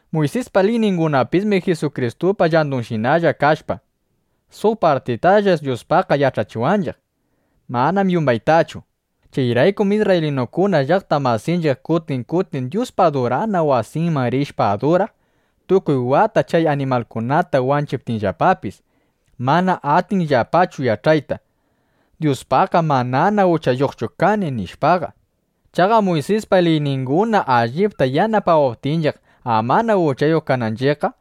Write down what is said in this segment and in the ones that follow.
Muysispa liyningunapismi Jisukristupa llandunshinalla kashpa, suq partitalla Dyuspaqqa yach'achiwanchiq. Manam yumbaytachu. Chayraykum isrraylinukuna llaqta masinchiq kutin kutin Dyuspa adurana wasinman rishpa aduraq, tukuy wata chay animalkunata wanchiptinllapapis, mana atinllapachu yach'ayta: Dyuspaqqam manana uchayuqchu kani, nishpaqa. Chaqa Muysispa liyninguna allipta yanapawaptinchiq amana uchayuq kananchiqqam,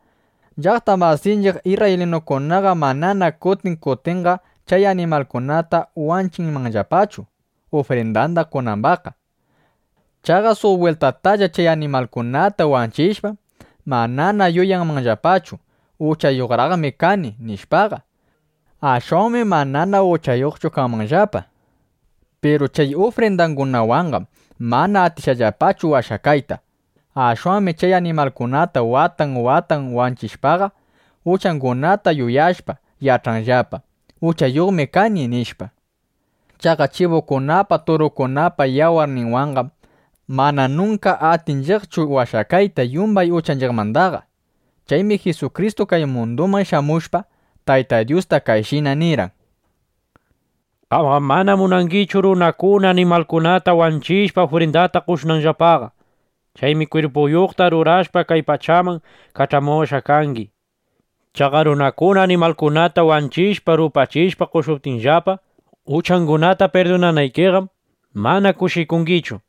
llaqta masinchiq isrraylinukunaqa manana kutin kutinqa chay animalkunata wanchinmanllapachu, ufrindanda qonambaqqa. Chaqa suq bwiltatalla chay animalkunata wanchishpam, manana yuyanmanllapachu: Uchayuqraqmi kani, nishpaqa. Ashwanmi manana uchayuqchu kanmanllapa. Piru chay ufrindangunawanqam mana atishqallapachu washakayta. Ashwanmi chay animalkunata watan watan wanchishpaqa, uchangunata yuyashpa, yach'anllapa: Uchayuqmi kani, nishpa. Chaqa chibukunapa turukunapa yawarninwanqam mana nunka atinchiqchu washakayta yumbay uchanchiqmandaqa. Chaymi Jisukristu kay munduman shamushpa, Tayta Dyusta kayshina nirqan: Qamqam mana munangichu, runakuna animalkunata wanchishpa, ufrindata qoshunanllapaqa. Chaymi kwirpuyuqta rurawashpa, kay pachaman kach'amuwashqa kangi. Chaqa runakuna animalkunata wanchishpa, rupachishpa, qoshuptinllapa, uchangunata pirdunanaykiqam, mana kushikungichu.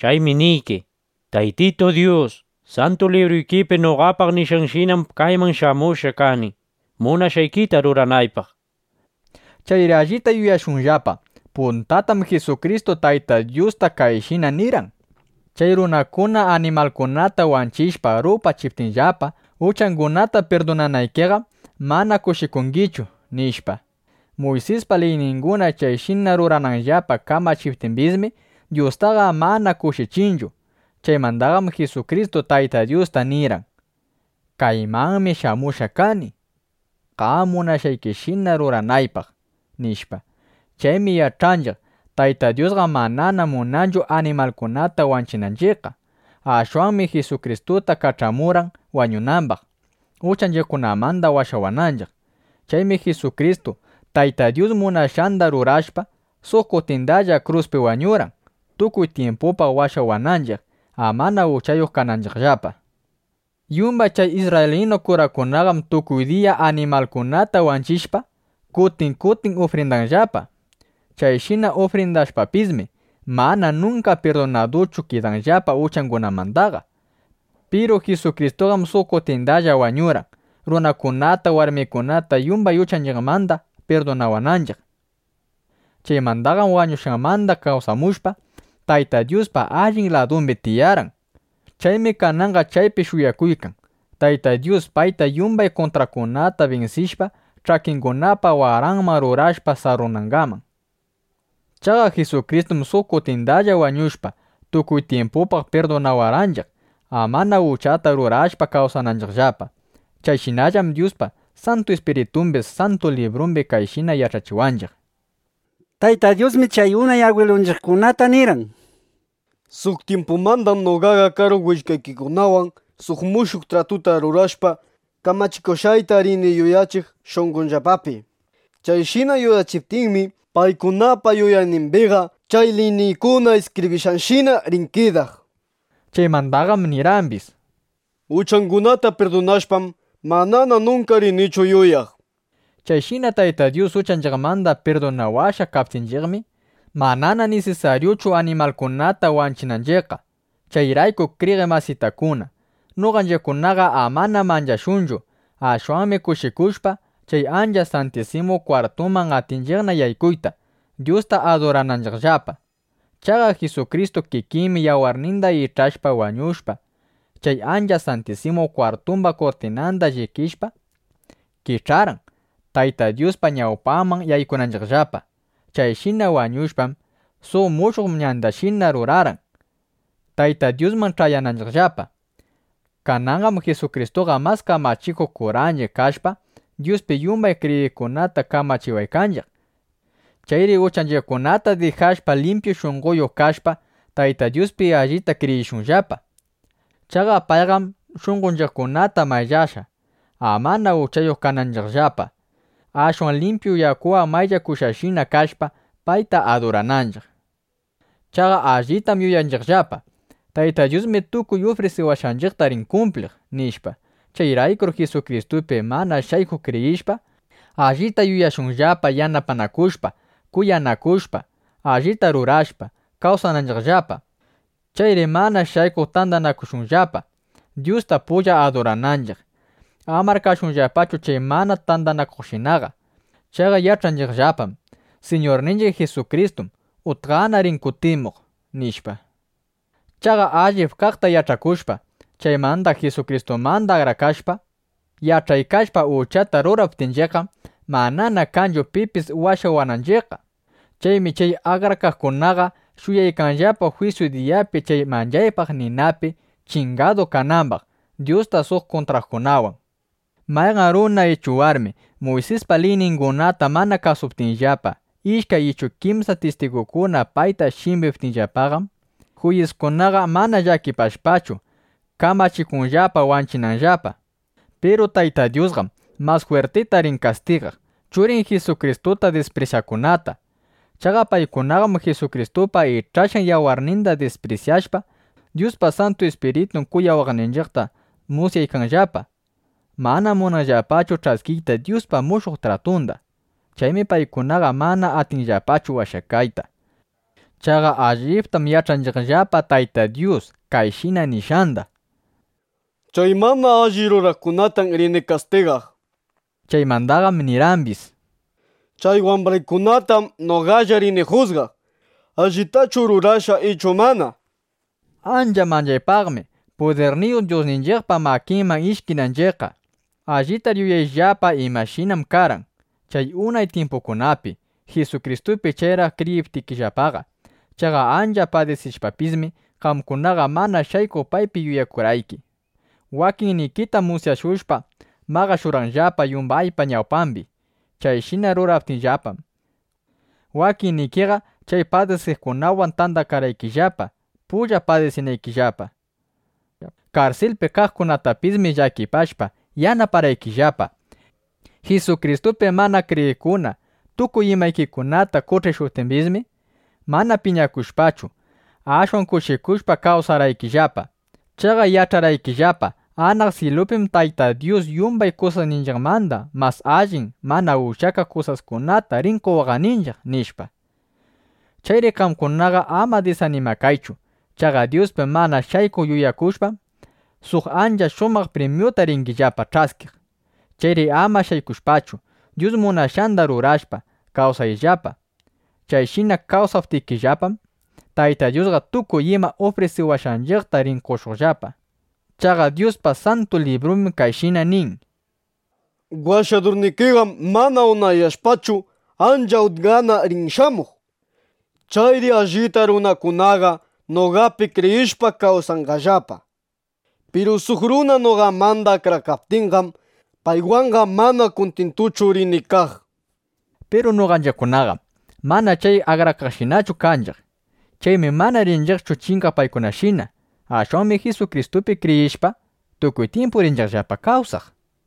Chaymi niyki: “Taytitu Dyus, Santu Libruyki noqapaq nishqanshinam kayman shamushqa kani, munashqaykita ruranaypaq”, nishpa. Chayri allita yuyashunllapa: Puntatam Jisukristu Tayta Dyusta kayshina nirqan: “Chay runakuna animalkunata wanchishpa, rupachiptinllapa, uchangunata pirdunanaykiqam, mana kushikungichu”, nishpa. Muysispa liyninguna chayshina rurananllapa kamachiptimbismi, Dyustaqa mana kushichinchu. Chaymandaqam Jisukristu Tayta Dyusta nirqan: “Kaymanmi shamushqa kani, qam munashqaykishina ruranaypaq”, nishpa. Chaymi yach'anchiq: Tayta Dyusqam manana munanchu animalkunata wanchinanchiqqa. Ashwanmi Jisukristuta kach'amurqan, wañunambaq, uchanchiqkunamanda washawananchiq. Chaymi Jisukristu, Tayta Dyus munashqanda rurashpa, suq kutindalla kruspi wañurqan, tukuy tyimpupaq washawananchiq, amana uchayuq kananchiqllapa. Yumbay chay isrraylinu kurakunaqam tukuy diya animalkunata wanchishpa, kutin kutin ufrindanllapa. Chayshina ufrindashpapismi, mana nunka pirdunaduchu kidanllapa uchangunamandaqa. Piru Jisukristuqam suq kutindalla wañurqan, runakunata, warmikunata yumbay uchanchiqmanda pirdunawananchiq. Chaymandaqam wañushqanmanda kawsamushpa, Tayta Dyuspa allin ladumbi tiyarqan. Chaymi kananqa chaypi shuyakuykan, Tayta Dyus payta yumbay kuntraqkunata binsishpa, ch'akingunapa waranman rurashpa sarrunangaman. Chaqa Jisukristum suq kutindalla wañushpa, tukuy tyimpupaq pirdunawarqanchiq, amana uchata rurashpa kawsananchiqllapa. Chayshinallam Dyuspa Santu Ispiritumbis Santu Librumbi kayshina yach'achiwanchiq: Tayta Dyusmi chay unay agwilunchiqkunata nirqan: Suq tyimpumandam noqaqa karu willkaykikunawan suq mushuq tratuta rurashpa, kamachikushqayta rini yuyachiq shunqonllapapi. Chayshina yuyachiptiymi, paykunapa yuyaynimbiqa chay liyniykuna iskibrishqashina rin kidaq, nishpa. Chaymandaqam nirqambis: Uchangunata pirdunashpam, manana nunka rinichu yuyaq, nishpa. Chayshina Tayta Dyus uchanchiqmanda pirdunawashqa kaptinchiqmi, manana nisisaryuchu animalkunata wanchinanchiqqa. Chayrayku kriyiq masitakuna, noqanchiqkunaqa amana manchashunchu. Ashwanmi kushikushpa, chay Ancha Santisimu Kwartuman atinchiqna yaykuyta, Dyusta adurananchiqllapa. Chaqa Jisukristu kikinmi yawarninda ich'ashpa, wañushpa, chay Ancha Santisimu Kwartumba kurtinanda llikishpa, kich'arqan, Tayta Dyuspa ñawpanman yaykunanchiqllapa. Chayshina wañushpam, suq mushuq ñandashina rurarqan, Tayta Dyusman ch'ayananchiqllapa. Kananqam Jisukristuqa mas kamachikuq kuranchiq kashpa, Dyuspi yumbay kriyiqkunata kamachiwaykanchiq. Chayri uchanchiqkunata dijashpa, limpyu shunqoyuq kashpa, Tayta Dyuspi allita kriyishunllapa. Chaqa payqam shunqonchiqkunata mayllashqa, amana uchayuq kananchiqllapa, ashwan limpyu yakuwan mayllakushqashina kashpa, payta adurananchiq. Chaqa allitam yuyakunchiqllapa: Tayta Dyusmi tukuy ufrisiwashqanchiqta rin kumpliq, nishpa. Chayraykur Jisukristupi mana shaykuq kriyishpa, allita yuyashunllapa, yanapanakushpa, kuyanakushpa, allita rurashpa, kawsananchiqllapa. Chayri mana shaykuq tandakashunllapa, Dyusta pulla adurananchiq. Amar kashunllapachu chay mana tandakaqkunashinaqa. Chaqa yach'anchiqllapam: Siñurninchiq Jisukristum utqana rin kutimuq, nishpa. Chaqa allip kaqta yach'akushpa, chaymanda Jisukristumanda akrakashpa, yach'aykashpa uchata ruraptinchiqqam, manana kanchu pipis washawananchiqqa. Chaymi chay akrakaqkunaqa shuyaykanllapa jwisyu diyapi chay manchaypaq ninapi chingadu kanambaq Dyusta suq kuntraqkunawan. Mayqan runa ichu warmi Muysispa liyningunata mana kasuptinllapa, ishkay ichu kimsa tistigukuna payta shimbiptinllapaqam, juyiskunaqa mana llakipashpachu, kamachikunllapa wanchinanllapa. Piru Tayta Dyusqam mas jwirtita rin kastigaq Churin Jisukristuta disprisyaqkunata. Chaqa paykunaqam Jisukristupa ich'ashqan yawarninda disprisyashpa, Dyuspa Santu Ispiritun kuyawaqninchiqta musyaykanllapa. Manam munanllapachu ch'askiyta Dyuspa mushuq tratunda. Chaymi paykunaqa mana atinqallapachu washakayta. Chaqa allitam yach'anchiqllapa Tayta Dyus kayshina nishqanda: “Chay mana alli ruraqkunatam rini kastigaq”, nishpa. Chaymandaqam nirqambis: “Chay wambraykunatam noqalla rini jusgaq, allitachu rurashqa ichu mana”, nishpa. ¡Ancha manchaypaqmi, pudirniyuq Dyusninchiqpa makinman ishkinanchiqqa! Allitar yuyayllapa imashinam karqan chay unay tyimpukunapi, Jisukristupi chayraq kriyiptikillapaqa. Chaqa ancha padisishpapismi, qamkunaqa mana shaykuq paypi yuyakurqayki. Wakinnikitam musyashushpa maqashurqanllapa yumbaypa ñawpambi. Chayshina ruraptinllapam, wakinnikiqa chay padisiqkunawan tandakarqaykillapa, pulla padisinaykillapa. Karsilpi kaqkunatapismi llakipashpa, yanaparqaykillapa. Jisukristupi mana kriyiqkuna tukuy imaykikunata qoch'ishuptimbismi, mana piñakushpachu, ashwan kushikushpa, kawsarqaykillapa. Chaqa yach'arqaykillapa: Anaq syilupim Tayta Dyus yumbay kusasninchiqmanda mas allin mana ushyakaq kusaskunata rin qowaqninchiq, nishpa. Chayri qamkunaqa ama disanimakaychu. Chaqa Dyuspi mana shaykuq yuyakushpaqam, suq ancha shumaq primyuta ringillapa ch'askiq. Chayri ama shaykushpachu, Dyus munashqanda rurashpa, kawsayllapa. Chayshina kawsaptikillapam, Tayta Dyusqa tukuy ima ufrisiwashqanchiqta rin qoshuqllapa. Chaqa Dyuspa Santu Librumbim kayshina nin: Washadurnikiqam mana unayashpachu, ancha utqana rin shamuq. Chayri allita ruraqkunaqa noqapi kriyishpa, kawsanqallapa. Piru suq runa noqamanda akrakaptinqam, paywanqa mana kuntintuchu rini kaq, nishpa. Piru noqanchiqkunaqam mana chay akrakaqshinachu kanchiq. Chaymi mana rinchiqchu chingaq paykunashina. Ashwanmi Jisukristupi kriyishpa, tukuy tyimpu rinchiqllapa kawsaq.